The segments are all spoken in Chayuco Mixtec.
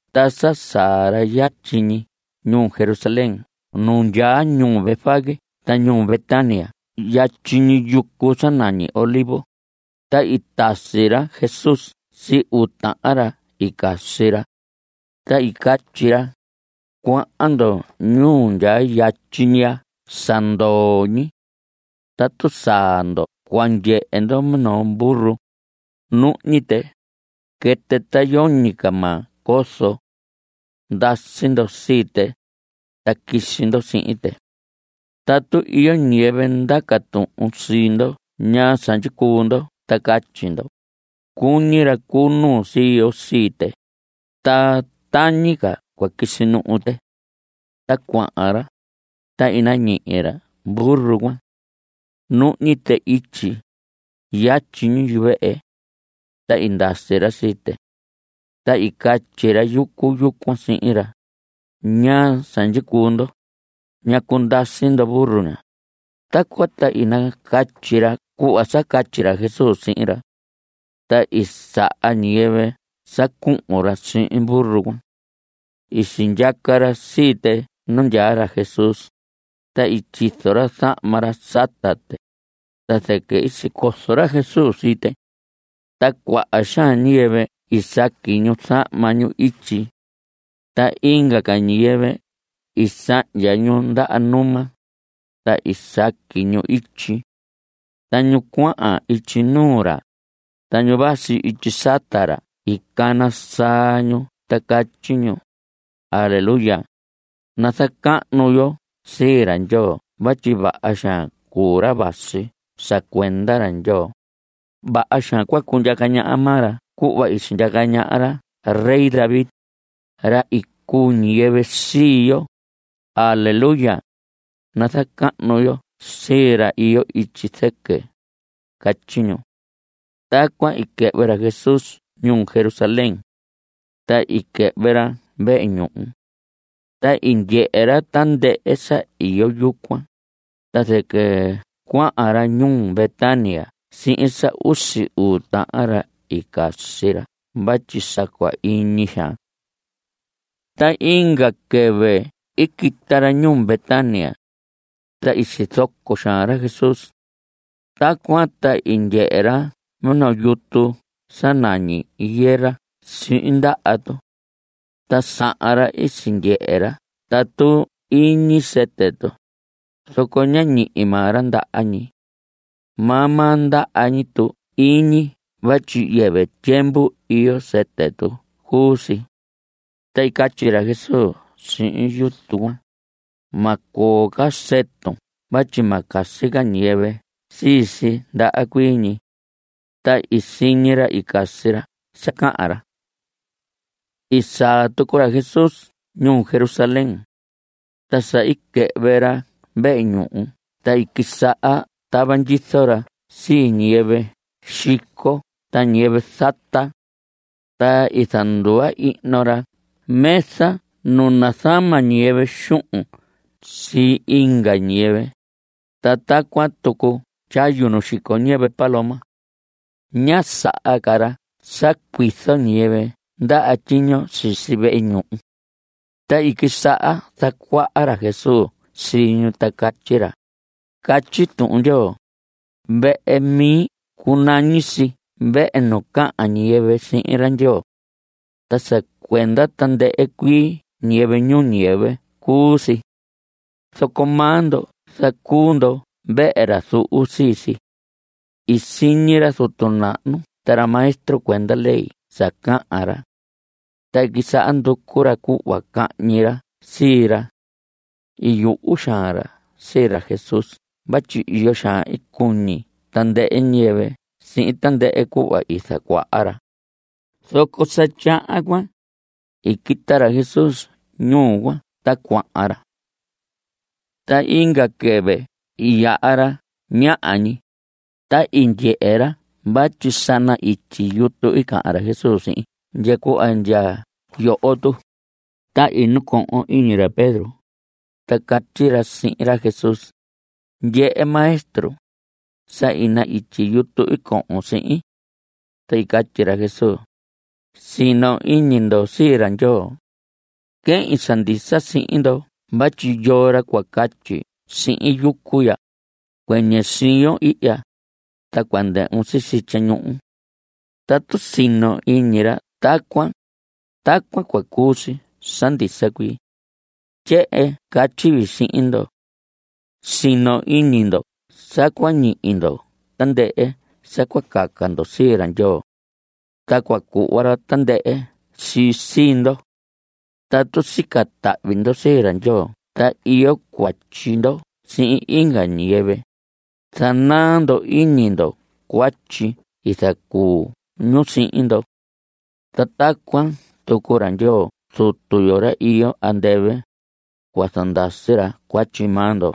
Ta sa saa ra yatyi ñi ñuu Jerusalén nu ndyaa ñuu Betfagé ta ñuu Betania yatyi ñi yucu sa nañi Olivos, ta i tasi ra Jesús sii uu tahan ra i casi ra. Ta i catyi ra: Cuahan ndo ñuu ndyaa yatyi ñi ya sa ndoo ñi. Tatu saa ndo cua ndyehe ndo minoo burro, nuhñi tɨ, quɨtɨ ta yoñi ca maa cozo. Ndasi ndo sii tɨ, ta quisi ndo sihin tɨ. Tatu iyo ñiyɨvɨ ndaca tuhun sii ndo ñaa sa ndyicuu ndo ta catyi ndo: “Cuñi ra cu nuu sii yo sii tɨ, ta tañi ca cua quisi nuhu tɨ.” Ta cuahan ra, ta i nañihi ra burro cuan. Nuhñi tɨ ityi, yatyi ñi yuvehe. Ta i ndasi ra sii tɨ. Ta i catyi ra yucu yucuan sihin ra: ¿Ñaa sa ndyicuu ndo? ¿Ñacu ndasi ndo burro ña? Tacuan ta i nacatyi ra cuhva sa catyi ra Jesús sihin ra. Ta i saha ñiyɨvɨ sa cuhun ra sihin burro cuan. I sindyaca ra sii tɨ nu ndyaa ra Jesús, ta i tyizo ra zahma ra sata tɨ, ta zɨquɨ i sicozo ra Jesús sii tɨ. Ta cuaha xaan ñiyɨvɨ i saqui ñu zahma ñu ityi. Ta inga ca ñiyɨvɨ i sahndya ñu ndaha numa, ta i saqui ñu ityi. Ta ñu cuahan ityi nuu ra, ta ñu vasi ityi sata ra i cana saa ñu ta catyi ñu: ¡Aleluya! ¡Nazacahnu yo sii ra Ndyoo vatyi vaha xaan cuu ra vasi sa cuenda ra Ndyoo! ¡Vaha xaan cua cundyaca ñaha maa ra cuhva i sindyaca ñaha ra rey David, ra i cuu ñiyɨvɨ sii yo! ¡Aleluya! ¡Nazacahnu yo sii ra iyo ityi zɨquɨ! Catyi ñu. Tacuan i quɨhvɨ ra Jesús ñuu Jerusalén. Ta i quɨhvɨ ra vehe ñuhu. Ta i ndyehe ra tandɨhɨ sa iyo yucuan, ta zɨquɨ cuahan ra ñuu Betania sihin sa usi uu tahan ra i casi ra vatyi sa cua iñi xaan. Ta inga quɨvɨ i quita ra ñuu Betania. Ta i sizoco xaan ra Jesús. Tacuan ta i ndyehe ra minoo yutu sa nañi higuera sihin ndaha tu. Ta sahan ra i sindyehe ra tatu iñi sɨtɨ tu, zoco ñá ñihi maa ra ndaha ñi. Maa maa ndaha ñi tu iñi vatyi yɨvɨ tyiemvu iyo sɨtɨ tu cuu si. Ta i catyi ra Jesús sihin yutu cuan: Ma coo ca sɨtun vatyi ma casi ca ñiyɨvɨ sii si ndaha cuii ñi. Ta i siñi ra i casi ra sa cahan ra. I saa tucu ra Jesús ñuu Jerusalén. Ta sa i quɨhvɨ ra vehe ñuhu ta i quisaha tava ndyizo ra sii ñiyɨvɨ xico ta ñiyɨvɨ zata. Ta i zanduva ihno ra mesa nu nazama ñiyɨvɨ xuhun sii inga ñiyɨvɨ, ta tacuan tucu tyayu nu xico ñiyɨvɨ paloma. Ñá saha ca ra sa cuizo ñiyɨvɨ ndaha tyiño sisi vehe ñuhu. Ta i quisaha zacuaha ra Jesús sii ñu ta catyi ra: Catyi Tuhun Ndyoo: “Vehe mi cunañi si vehe nu cahan ñiyɨvɨ sihin ra Ndyoo. Ta sa cuenda tandɨhɨ cuii ñiyɨvɨ ñuu ñiyɨvɨ cuu si.” Zoco maa ndo zacuu ndo vehe ra zuhu sii si. I siñi ra zutu nahnu ta ra maestro cuenda ley sa cahan ra. Ta i quisaha nducu ra cuhva cahñi ra sii ra. I yuhu xaan ra sii ra Jesús vatyi iyo xaan i cuñi tandɨhɨ ñiyɨvɨ sihin tandɨhɨ cuhva i zacuaha ra. Zoco sa tyahan cuan, i quita ra Jesús ñuu cuan ta cuahan ra. Ta inga quɨvɨ i yaha ra ñaha ñi, ta i ndyehe ra vatyi sa na‑ityi yutu i cahan ra Jesús sihin ndya cuhva ndya yoho tu. Ta i nacohon iñi ra Pedro, ta catyi ra sihin ra Jesús: Ndyehe Maestro, sa i na‑ityi yutu i cohon sihin. Ta i catyi ra Jesús: Sino iñi ndo sii ra Ndyoo. Quehin sa ndisa sihin ndo vatyi yoo ra cua catyi sihin yucu ya: “Cuɨñɨ siyon ihya, ta cua ndɨhvun sisi tyañuhu.” Tatu sino iñi ra tacuan, tacuan cua cuu si sa ndisa cuii. Tyehen catyi vii sihin ndo: Sino iñi ndo sa cua ñihi ndo tandɨhɨ sa cua caca ndo sii ra Ndyoo. Ta cua cuhva ra tandɨhɨ si sii ndo. Tatu sica tahvi ndo sii ra Ndyoo ta iyo cuatyi ndo sihin inga ñiyɨvɨ, zanaa ndo iñi ndo cuatyi i zacuu ñu sihin ndo. Ta tacuan tucu ra Ndyoo Zutu yo, ra iyo andɨvɨ, cua zandasi ra cuatyi maa ndo.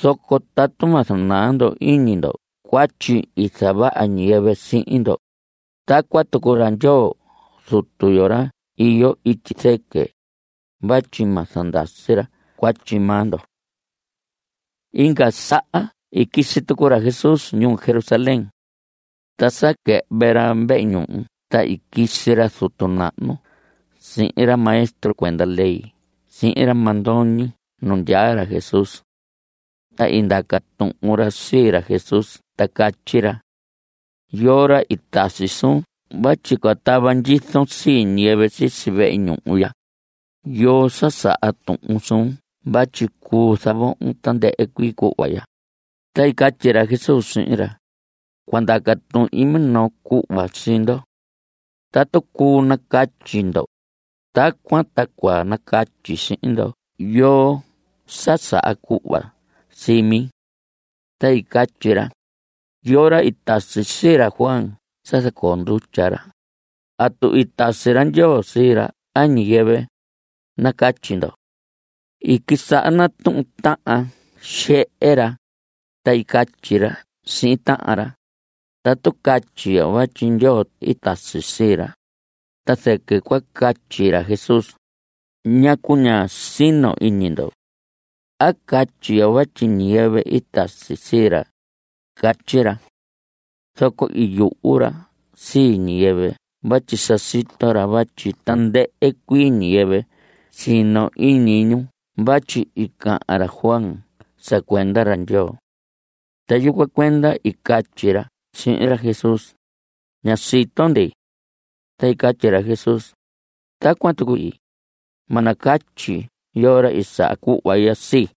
Zoco tatu ma zanaa ndo iñi ndo cuatyi i zavaha ñiyɨvɨ sihin ndo, tacuan tucu ra Ndyoo Zutu yo, ra iyo ityi zɨquɨ, vatyi ma zandasi ra cuatyi maa ndo. Inga saha i quisi tucu ra Jesús ñuu Jerusalén. Ta sa quɨhvɨ ra vehe ñuhu ta i quisi ra zutu nahnu sihin ra maestro cuenda ley sihin ra mandoñi nu ndyaa ra Jesús. Ta i ndaca tuhun ra sii ra Jesús ta catyi ra: ¿Yoo ra i tasi suun vatyi cua tava ndyizon sii ñiyɨvɨ sisi vehe ñuhu ya? ¿Yoo sa saha tuhun suun vatyi cuu zavohon tandɨhɨ cuii cuhva ya? Ta i catyi ra Jesús sihin ra: Cua ndaca tuhin minoo cuhva sii ndo. Tatu cuu nacatyi ndo, tacuan ta cua nacatyi sihin ndo yoo sa saha cuhva sii mi. Ta i catyi ra: ¿Yoo ra i tasi sii ra Juan sa zacoo ndutya ra? ¿Atu i tasi ra Ndyoo sii ra a ñiyɨvɨ? Nacatyi ndo. I quisaha natuhun tahan xehe ra, ta i catyi ra sihin tahan ra: Tatu catyi yo vatyi Ndyoo i tasi sii ra, ta zɨquɨ cua catyi ra Jesús: “¿Ñacu ñá sino iñi ndo?” ¿A catyi yo vatyi ñiyɨvɨ i tasi sii ra? Catyi ra. Zoco i yuhu ra sii ñiyɨvɨ vatyi sa sito ra vatyi tandɨhɨ cuii ñiyɨvɨ sino iñi ñu vatyi i cahan ra Juan sa cuenda ra Ndyoo. Ta yucuan cuenda i catyi ra sihin ra Jesús: Ña sito ndi. Ta i catyi ra Jesús: Tacuan tucu ii, ma nacatyi yoo ra i saha cuhva ya sii.